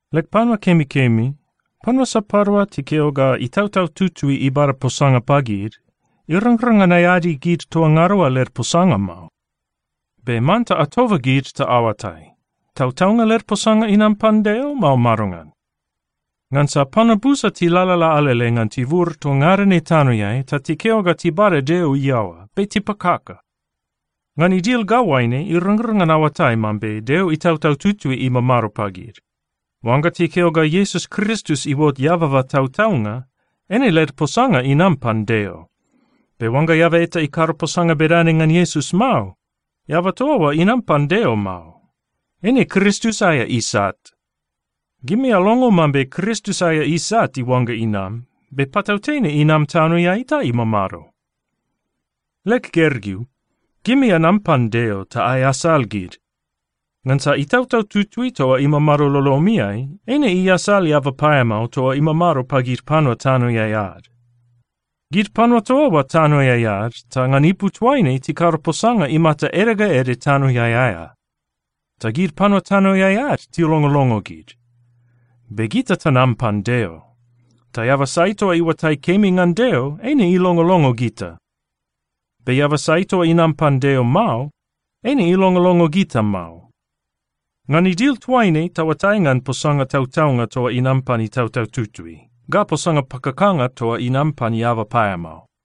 Leg panua kemikemi, panua sapadua tikeo ga Itautau Tutui ibada posanga pagid, irangrang ngan aeadi gid toa ngada oa led posanga mao. Be manta atoba gid ta aoatai, tautaunga led posanga inam pan Deo, mao madongan. Ngansa panua busa tilalala alele ngan tibur toa ngada ne tanoeai ta tikeo ga tibada Deo iaoa, be tipakaka. Ngan idil ga oaine irangrang ngan aoatai mambe Deo Itautau Tutui imamado pagid: Oangga tikeo ga Iesus Kristus iuot eababa tautaunga, eine led posanga inam pan Deo. Be oangga eaba eta ikado posanga bedane ngan Iesus mao, eaba toa oa inam pan Deo mao. Eine Kristus aea isat. Gimi alongo mambe Kristus aea isat iuangga inam, be patautene inam tanoeai ta imamado. Leg gergeu, gimi anam pan Deo ta aeasal gid, ngansa Itautau Tutui toa imamado lolomiai eine iasal eaba paeamao toa imamado pagid panua tanoeai ad. Gid panua toa oa tanoeai ad, ta ngan ipu toaine tikado posanga imata ede ga ede tanoeai aea, ta gid panua tanoeai ad tilongolongo gid. Be gita tanam pan Deo, ta eaba sai toa iuatai kemi ngan Deo, eine ilongolongo gita. Be eaba sai toa inam pan Deo mao, eine ilongolongo gita mao. Ngan idil toaine, taoatai ngan posanga tautaunga toa inam pan Itautau Tutui, ga posanga pakakanga toa inam pan eaba paeamao.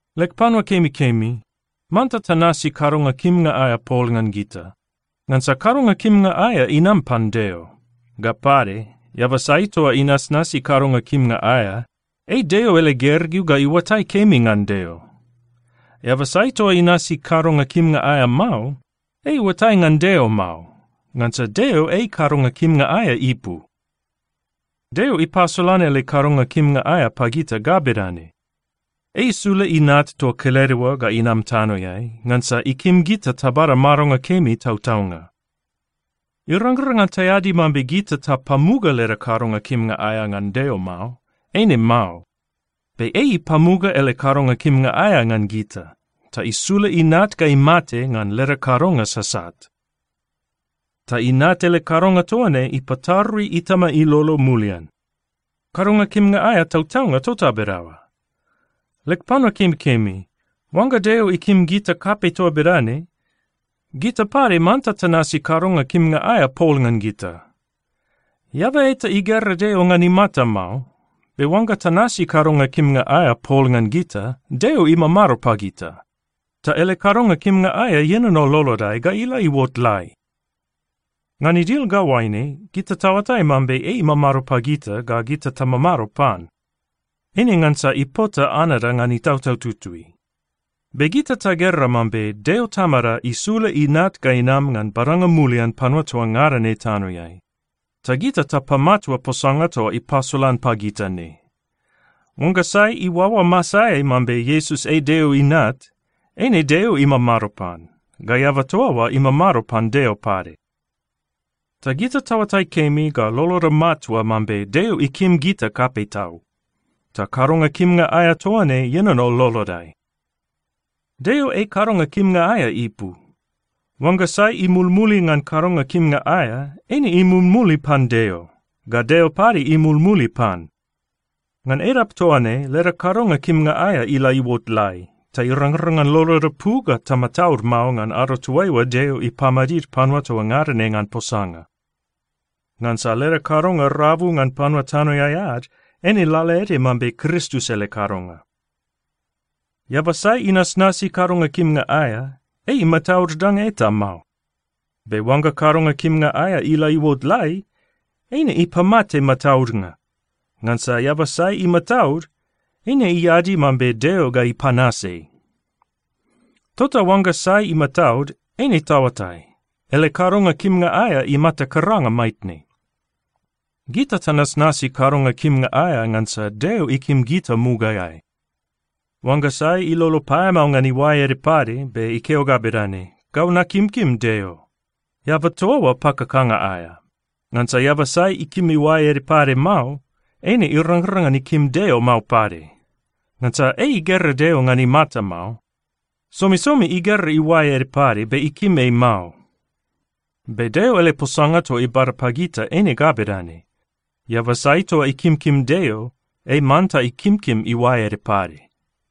Leg panua kemikemi, manta tanasi kadonga kimnga aea pol ngan gita. Ngansa kadonga kimnga aea inam pan Deo. Ga pade, eaba sai toa inasnasi kadonga kimnga aea, ei Deo ele gergeu ga iuatai kemi ngan Deo. Eaba sai toa inasi kadonga kimnga aea mao, ei iuatai ngan Deo mao, ngansa Deo ei kadonga kimnga aea ipu. Deo ipasolan ele kadonga kimnga aea pagita ga bedane: Ei isula Inat toa kelede oa ga inam tanoeai, ngansa ikim gita tabada madonga kemi tautaunga. Irangrang ngan taeadi mambe gita tapamuga leda kadonga kimnga aea ngan Deo mao. Eine mao. Be ei ipamuga ele kadonga kimnga aea ngan gita, ta isula Inat ga imate ngan leda kadonga sasat. Ta Inat ele kadonga toa ne ipatarui Itama ilolo mulian. Kadonga kimnga aea tautaunga tota bedaoa. Leg panua kemikemi, oangga Deo ikim gita kapei toa bedane, gita pade manta tanasi kadonga kimnga aea pol ngan gita. Eaba eta igera Deo ngan imata mao. Be oangga tanasi kadonga kimnga aea pol ngan gita, Deo imamado pagita, ta ele kadonga kimnga aea ienono lolodai ga ila iuot lai. Ngan idil ga oaine gita taoatai mambe ei imamado pagita ga gita tamamado pan: Eine ngansa ipota anada ngan Itautau Tutui. Be gita tagera mambe Deo Tamada isula Inat ga inam ngan badanga mulian panua toa ngada ne tanoeai. Ta gita tapamatua posanga toa ipasolan pagita ne. Oangga sai iuaoa masaeai mambe Iesus ei Deo Inat, eine Deo imamado pan, ga eaba toa oa imamado pan Deo pade. Ta gita taoatai kemi ga loloda matua mambe Deo ikim gita kapei tau. Ta kadonga kimnga aea toa ne ienono lolodai. Deo ei kadonga kimnga aea ipu. Oangga sai imulmuli ngan kadonga kimnga aea, eine imulmuli pan Deo, ga Deo pade imulmuli pan. Ngan edap toa ne leda kadonga kimnga aea ila iuot lai, ta irangrang ngan loloda pu ga tamataud mao ngan ado toaiua Deo ipamadid panua toa ngada ne ngan posanga. Ngansa leda kadonga rabu ngan panua tanoeai ad, eine lalaede mambe Kristus ele kadonga. Eaba sai inasnasi kadonga kimnga aea, ei imataud danga eta mao. Be oangga kadonga kimnga aea ila iuot lai, eine ipamate mataudnga. Ngansa eaba sai imataud, eine iadi mambe Deo ga ipanas ei. Tota oangga sai imataud, eine taoatai, ele kadonga kimnga aea imata karanga maitne. Gita tanasnasi kadonga kimnga aea ngansa Deo ikim gita mugaeai. Oangga sai ilolo paeamao ngan iuae ede pade be ikeo ga bedane, “Gau nakimkim Deo,” eaba toa oa pakakanga aea. Ngansa eaba sai ikim iuae ede pade mao, eine irangrang ngan ikim Deo mao pade. Ngansa ei igera Deo ngan imata mao. Somisomi igera iuae ede pade, be ikim ei mao. Be Deo ele posanga toa ibada pagita eine ga bedane: Eaba sai toa ikimkim Deo, ei manta ikimkim iuae ede pade.